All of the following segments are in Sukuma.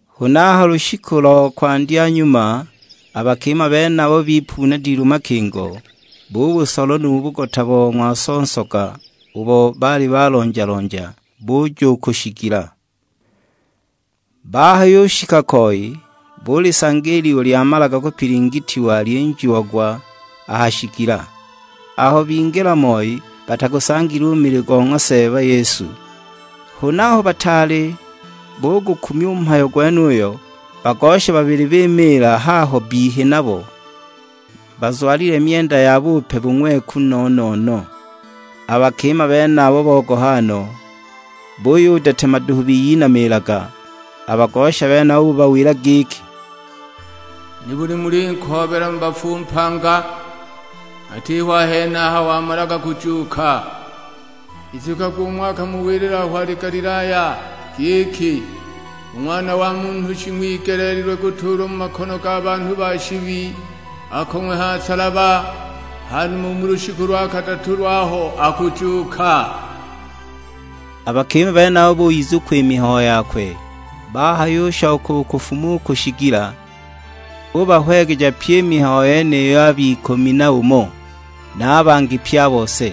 Huna a ha lushiku lo kwandya nyuma a bakima benabo bipuna dilu makingo, bubusola nu bugota bo ng'waso nsoga ubo baali balonja-lonja, buja u ku shigila. Bahayushika koi, bulisanga i liwe lyamalaga kupilingitiwa lyinjiagwa a ha shigila. Aho bingila moi batagusangile u mili go ng'wa Seeba Yesu. Huna aho bataali bugukumya u mhayo gwenuyo, bagosha babili bimiila haho bbihi nabo, bazwalile myenda ya bupe bung'weku no-no-no. A bakima benabo bogoha no, buyudetema duhu biyinamiilaga; a bagosha benabo bubawila giki, "Nibuli mulinkoobela mu bafu u mpanga? Atiho a henaha wamalaga kujuuka. Izukagwi umo akamuwilila aho wali Galilaya; giki, 'U Ng'wana wa Munhu shing'wigeleelilwe kutuulwa mu makono ga banhu ba shibi akong'we ha nsalaba, hanuma u mu lushiku lo kadatu lwaho akujuuka.' " A bakima benabo buyizukwa i mihayo yakwe. Bahayushoka u kufuma u ku shigila, bubahwegeja pyi i mihayo yeniyo ab'ikumi na umo, na a bangi pye a bose.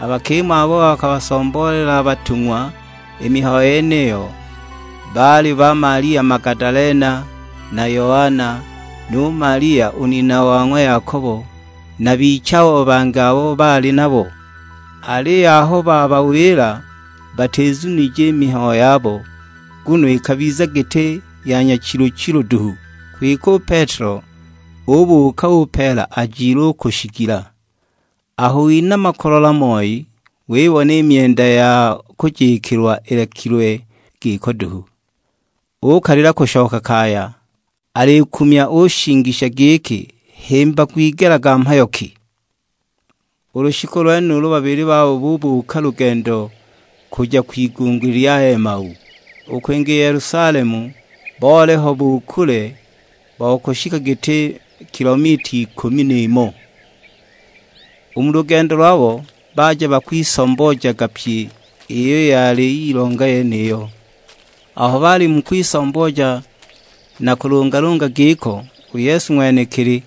A bakima abo bakabasomboolela a batung'wa i mihayo yeniyo baali ba Malia Magadalena, na Yoana, nu Malia u nina wa ng'wa Yakobo, na bichabo bangi abo baali nabo. Aliyo aho babawila batizunije i mihayo yabo, nguno ikabiza giti ya nyachilu-chilu duhu. Kwike u Petelo ubuuka, upeela ajile u ku shigila; aho winama kulola moi wibona i myenda ya kujikilwa ilekilwe giko duhu. Ukalila kushoka kaya, alikumya ushingisha giki himba gwigelega mhayo ki! U lushiku lwenulo babili babo bubuuka lugendo kuja kwigunguli lya Emau, u kwinga i Yelusalemu boliho bu kule bo kushika giti kilomita ikumi n'imo. U mu lugendo lwabo baja bakwisomboojaga pyi iyo yali yilonga yeniyo. Aho bali mu kwisombooja na kulungalunga giko, u Yesu ng'wenekili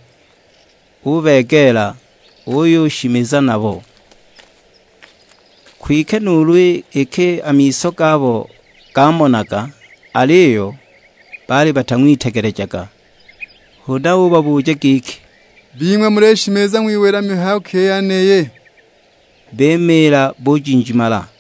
ubegeela, uyushimiza nabo. Kwike nuulu iki a miso gabo gamonaga, aliyo baali batang'witegelejaga. Huna ubabuja giki, "Bing'we, mulishimiza ng'wiwila mihayo ki i yeniyi?" Bimiila bujinjimala!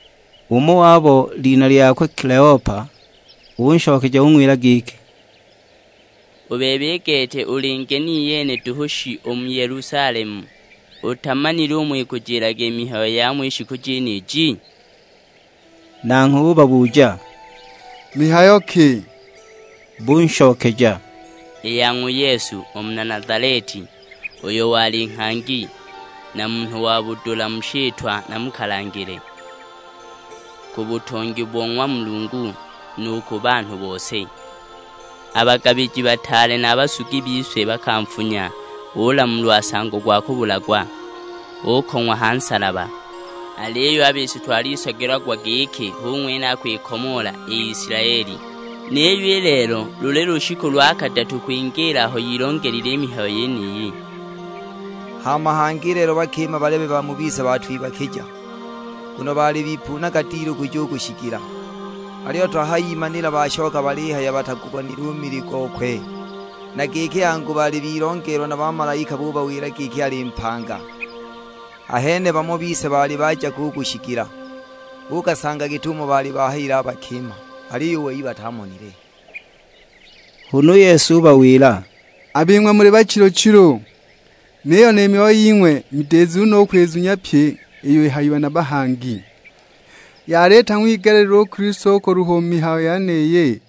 Umo wabo, lina lyakwe Kileopa, unshokeja ung'wila giki, "U bebe, i gete uli ngeni iyene duhu shi u mu Yelusalemu? Utamanile umo ikujilaga i mihayo yamo i shiku jeniji?" Nanghwe ubabuja, "Mihayo ki?" Bunshokeja, "I ya ng'wa Yesu, u muna Nazaleti. Uyo wali nghangi, na munhu wa budula mu shitwa na mu kalangile, ku butongi bo ng'wa Mulungu; nu ku banhu bose! A bagabiji bataale na a basugi bise bakanfunya ulamulwa nsango gwa kubulagwa, ukong'wa ha nsalaba! Aliyo a bise twalisagilagwa giki hu ng'wene akwikomoola i Isilaeli! Niyo i lelo luli lushiku lo kadatu kwingiila aho yilongelile i mihayo yeniyi. Hama hangi i lelo bakima balebe ba mu bise batwibakija; nguno baali bipuunaga dilu kuja u ku shigila. Aliyo twahayagimanila bashoka balihaya batagubonile u mili gokwe, na giki angu baali bilongelwa na bamalaika bubawila giki ali mpanga! Ahene bamo bise baali baja ko u ku shigila, buukasanga git'umo baali bahayila a bakima; aliyo u wei batamonile!" Huna u Yesu ubawila, "A bing'we muli bachilu-chilu, niyo ni myoyo ying'we midizu no u kwizunya pyi iyo ihayiwe na bahangi. Yali itang'wigeleelilwe u Kilisto kuluha u mu mihayo yeniyi,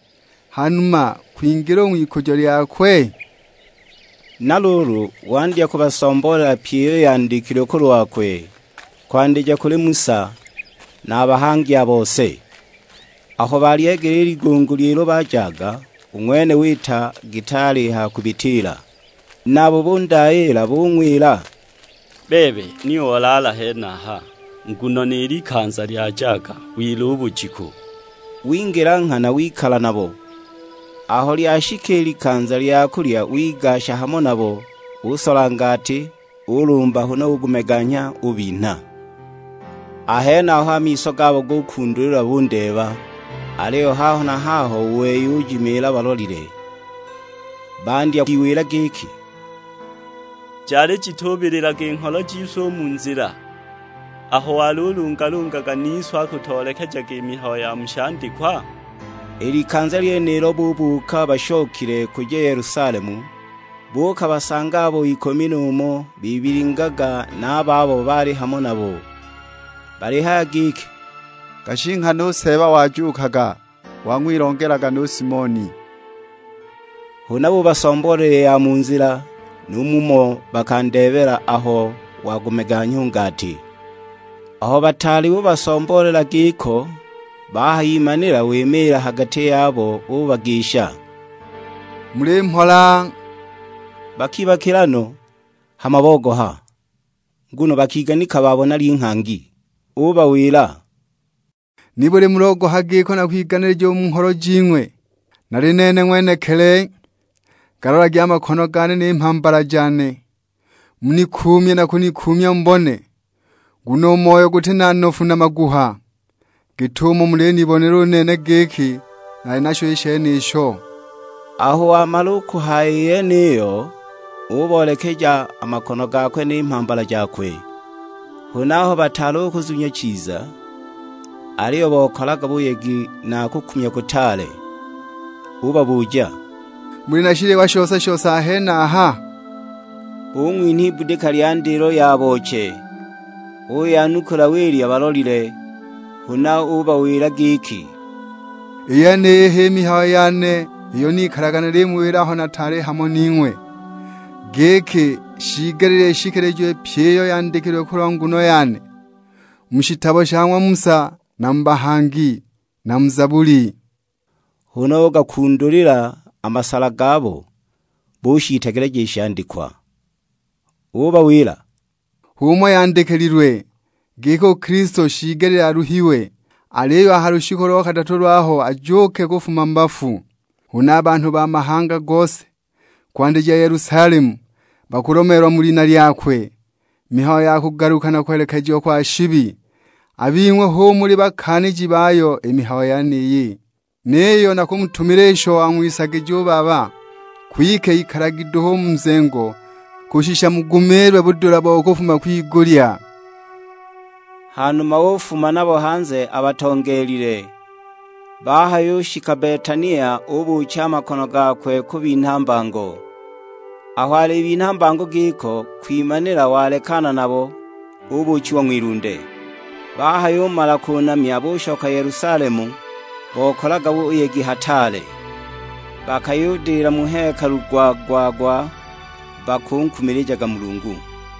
hanuma kwingila u ng'wikujo lyakwe?" Na luulu wandya kubasomboolela pyi iyo yandikilwe kulwakwe, kwandija kuli Musa, na a bahangi a bose. Aho balyegeela i ligunguli ilo bajaga, u ng'wene wita giti alihaya kubitiila. Nabo bundayiila bung'wila, "Bebe, ni olaala henaha; nguno ni likanza lyajaga, wila u bujiku!" Wingila nghana wikala nabo. Aho lyashika i likanza lya kulya wigasha hamo nabo, usola ngati, ulumba, huna ugumeganya ubinha. A henaho a miso gabo gukundulilwa bundeeba; aliyo haho na haho u wei ujimiila balolile. Bandya kwiwila giki, "Jali jitubililaga i ngholo jise u mu nzila, aho walulungalungaga nise, akutoolekejaga i mihayo ya mu shandikwa?" I likanza lyenilo bubuuka bashokile kuja Yelusalemu, buukabasanga abo ikumi na umo bibilingaga na a babo baali hamo nabo, balihaya giki, "Gashi nghana u Seeba wajuukaga; wang'wilongelaga nu Simoni." Huna bubasomboolela i ya mu nzila, nu mumo bakandeebela aho wagumeganya u ngati! Aho bataali bubasomboolela giko, bahayimanila wimiila ha gati yabo ubagisha, "Muli mhola!" Bakibakila no, hama bogoha; nguno bakiganika babona linghangi. Ubawila, "Nibuli mulogoha giko na kwiganilija u mu ngholo jing'we? Nali nene ng'wenekili, galolagi a makono gane ni mhambala jane; munikuumye na kunikuumya mubone, nguno u moyo guti na nofu na maguha, git'umo mulinibonela u nene giki nali nasho i shenisho." Aho wamala u kuhaya i yeniyo, uboolekeja a makono gakwe ni mhambala jakwe. Huna aho bataali u kuzunya chiza, aliyo bokalaga buyegi na kukumya kutaale; ubabuja, "Muli na shiliwa shose-shose a henaha?" Bung'winha ibudika lya ndilo ya booche. Uyanukula wilya balolile. Huna ubawila giki, "I yeniyi h'i mihayo yane iyo nikalaga numuwila aho naali nataali hamo ning'we, giki shiigelile ishikilijiwe pyi iyo yandikilwe kulwa nguno yane, mu shitabo sha ng'wa Musa na mu bahangi, na mu Zabuli." Huna ugakundulila a masala gabo, bushiitegeleja i shandikwa. Ubawila, "H'umo yandikililwe; giki u Kilisto shiigelile aluhiwe, aliyo a ha lushiku lo kadatu lwaho ajuuke kufuma mu bafu. Huna a banhu ba mahanga gose, kwandija Yelusalemu, bakulomeelwa mu lina lyakwe, mihayo ya kugaluka na kulekejiwa kwa shibi. A bing'we hu muli bakaaniji bayo i mihayo yeniyi. Niyo nakumutumila isho wang'wisagija u Baba; kwike ikalagi duhu u mu nzengo, kushisha mugumiilwe budula bo kufuma kwigulya." Hanuma ufuma nabo hanze abatongeelile; bahayushika Betania ubuucha a makono gakwe kubinha mbango. Aho alibinha mbango giko, kwimanila walekana nabo, ubuuchiwa ng'wilunde. Bahayumala kunamya bushoka Yelusalemu bokalaga buyegi hataale. Bakayudila mu hekalu gwa-gwa-gwa bakunkumilijaga Mulungu.